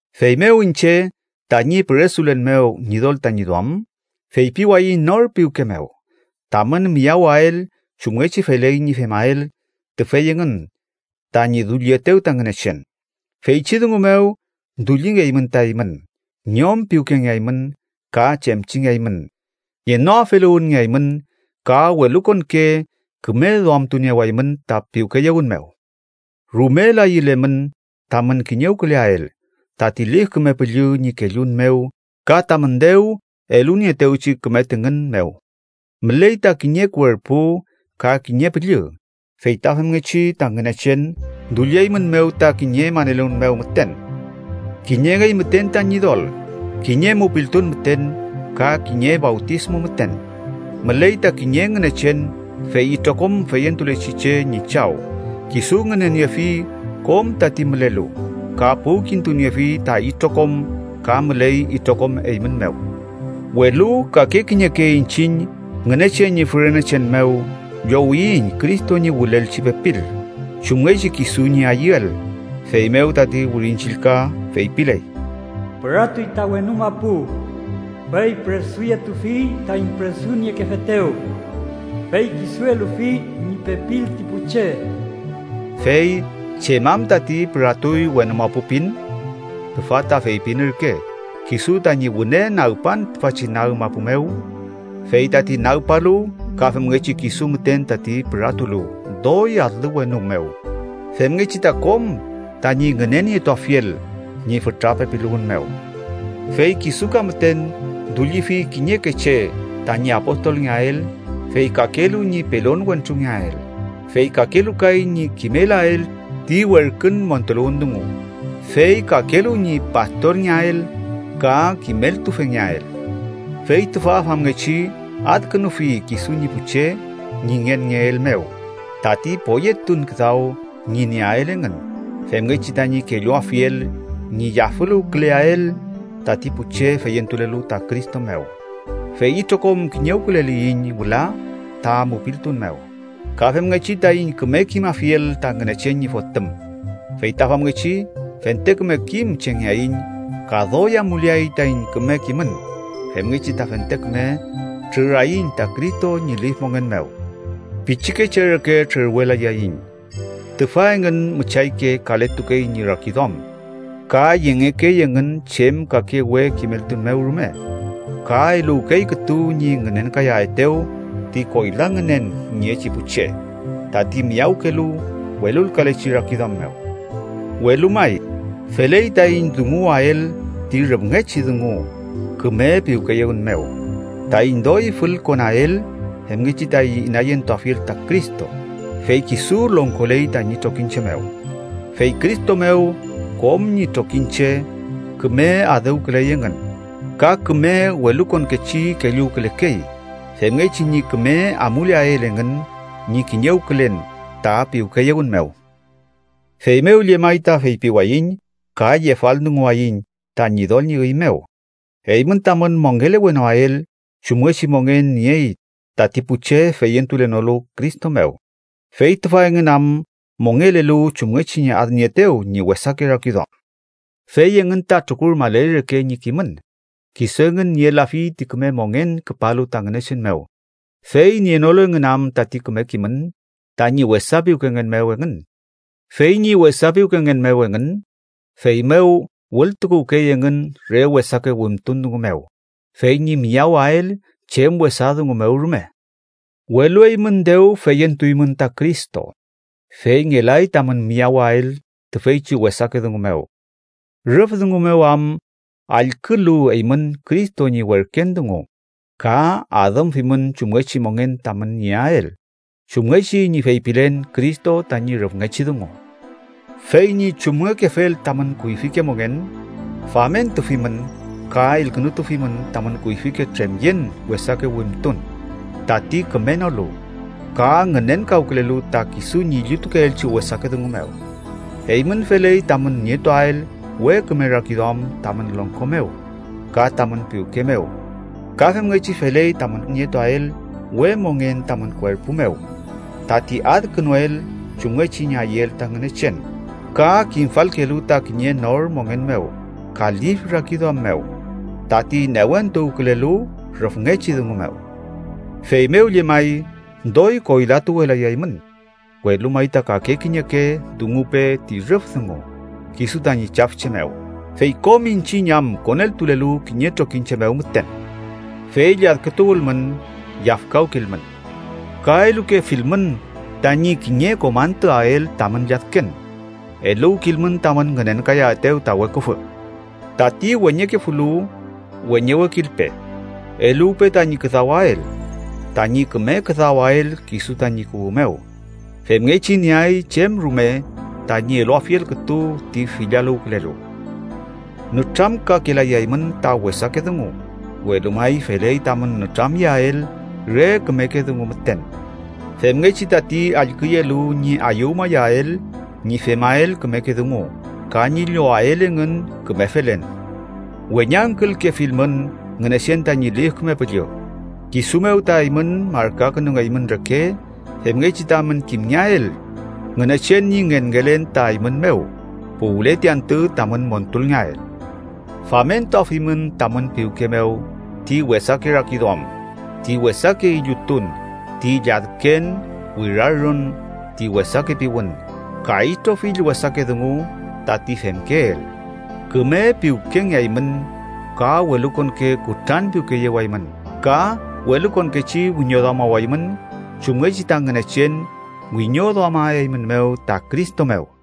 Feymew iñche, tañi püresulen mew Ñidol tañi duam, feypiwayiñ nor piwke mew tamün miyawael chumngechi feley ñi femael tüfey engün tañi dullietew ta Ngünechen. Feychi dungu mew dullingeymün ta eymün. Ñom piwkengeaymün, ka chemchingeaymün, ngenoafeluwünngeaymün ka welukonke küme duamtuniewaymün ta piwkeyewün mew. Rumel ayülemün tamün kiñewküleael, tati Lif Küme Püllü ñi kellun mew ka tamün dew elunieetewchi küme tüngün mew. Müley ta kiñe kuerpu ka kiñe Püllü, feyta femngechi ta Ngünechen dullieymünmew ta kiñe maneluwün mew müten. Kiñengey müten ta Ñidol, kiñe mupiltun müten ka kiñe fawtismu müten. Müley ta kiñe Ngünechen, fey itrokom feyentulechi che ñi Chaw, kisu ngüneniefi kom tati mülelu, ka puwkintuniefi ta itrokom ka müley itrokom eymün mew. Welu kake kiñeke iñchiñ Ngünechen ñi fürenechen mew llowiyiñ Cristo ñi wülelchi pepil, chumngechi kisu ñi ayüel. Feymew tati Wirin Chillka feypiley: “Püratuy ta wenu mapu, fey püresuyetufi taiñ püresuniekefetew, fey kisu elufi ñi pepil ti pu che.” Fey ¿chem am tati “püratuy wenu mapu” pin? Tüfa ta feypin ürke kisu tañi wüne nagpan tüfachi nag mapu mew. Fey tati nagpalu ka femngechi kisu müten tati püratulu doy alü wenu mew, femngechi ta kom tañi ngünenietuafiel ñi fütra pepiluwün mew. Fey kisu ka müten dullifi kiñeke che tañi apostolngeael, fey kakelu ñi pelon wentrungeael, fey kakelu kay ñi kimelael ti werkün montuluwün dungu, fey kakelu ñi pastorngeael ka kimeltufengeael. Fey tüfa famngechi adkünufi kisu ñi pu che ñi ngenngeel mew tati poyetun küdaw ñi nieael engün, femngechi tañi kelluafiel ñi yafüluwküleael tati pu che feyentulelu ta Cristo mew. Fey itrokom kiñewküleliyiñ wüla ta mupiltun mew ka femngechi taiñ küme kimafiel ta Ngünechen ñi Fotüm. Fey ta famngechi fente küme kim chengeaiñ ka doy amuleay taiñ küme kimün femngechi ta fente küme trüraiñ ta Cristo ñi lif mongen mew. Pichikeche reke trürwelayaiñ. Tüfa engün müchayke kaletukey ñi rakiduam ka yengekey engün chem kake we kimeltun mew rume ka eluwkey kütu ñi ngünenkayaetew ti koyla ngünen niechi pu che tati miyawkelu welulkalechi rakiduam mew. Welu may, feley taiñ dunguwael ti rüfngechi dungu küme piwkeyewün mew, taiñ doy fülkonael femngechi taiñ inayentuafiel ta Cristo, fey kisu longkoley tañi trokiñche mew. Fey Cristo mew kom ñi trokiñche küme adüwküley engün. Ka küme welukonkechi kelluwkülekey, femngechi ñi küme amuleael engün ñi kiñewkülen ta piwkeyewün mew. Feymew llemay ta feypiwayiñ ka yefaldunguwayiñ ta Ñidol ñi üy mew: eymün tamün mongelewenoael chumngechi mongen niey tati pu che feyentulenolu Cristo mew, fey tüfa engün am mongelelu chumngechi ñi adnieetew ñi wesake rakiduam. Fey engün ta trukurmaley reke ñi kimün. Kisu engün nielafi ti küme mongen küpalu ta Ngünechen mew, fey nienolu engün am tati küme kimün tañi wesa piwkengen mew engün. Fey ñi wesa piwkengen mew engün, feymew wültukuwkey engün re wesake wimtun dungu mew, fey ñi miyawael chem wesa dungu mew rume. Welu eymün dew feyentuymün ta Cristo, fey ngelay tamün miyawael tüfeychi wesake dungu mew, rüf dungu mew am allkülu eymün Cristo ñi werken dungu ka adümfimün chumngechi mongen tamün nieael, chumngechi ñi feypilen Cristo tañi rüfngechi dungu. Fey ñi chumngekefel tamün kuyfike mongen, famentufimün ka elkünutufimün tamün kuyfike tremyen wesake wimtun, tati kümenolu, ka ngünenkawkülelu ta kisu ñi illutukeelchi wesake dungu mew. Eymün feley tamün nietuael we küme rakiduam tamün longko mew, ka tamün piwke mew. Ka femngechi feley tamün nietuael we mongen tamün kuerpu mew, tati adkünuel chumngechi ñi ayüel ta Ngünechen, ka kimfalkelu ta kiñe nor mongen mew ka lif rakiduam mew, tati newentuwkülelu rüfngechi dungu mew. Feymew llemay, doy koylatuwelayaymün, “welu may ta kake kiñeke dungupe ti rüf dungu kisu tañi chafche mew”, fey kom iñchiñ am koneltulelu kiñe trokiñche mew müten. “Fey lladkütuwülmün, yafkawkilmün”, ka elukefilmün tañi kiñe kom antüael tamün lladken. Eluwkilmün tamün ngünenkayaetew ta weküfü. Tati weñekefulu, weñewekilpe; eluwpe tañi küdawael, tañi küme küdawael kisu tañi kuwü mew, femngechi nieay chem rume tañi eluafiel kütu ti fillaluwkülelu. Nütramkakelayaymün ta wesake dungu, welu may feley tamün nütramyeael re kümeke dungu müten, femngechi tati allküyelu ñi ayüwmayael ñi femael kümeke dungu ka ñi llowael engün küme felen. Weñangkülkefilmün Ngünechen tañi Lif Küme Püllü, kisu mew ta eymün markakünungeymün reke femngechi tamün kimngeael Ngünechen ñi ngenngelen ta eymün mew puwle ti antü tamün montulngeael. Famentuafimün tamün piwke mew ti wesake rakiduam, ti wesake illutun, ti lladken, wirarün, ti wesake piwün, ka itrofill wesake dungu tati femkeel. Küme piwkengeaymün ka welukonke kutranpiwkeyewaymün ka welukonkechi wiñoduamawaymün chumngechi ta Ngünechen wiñoduamaeymünmew ta Cristo mew.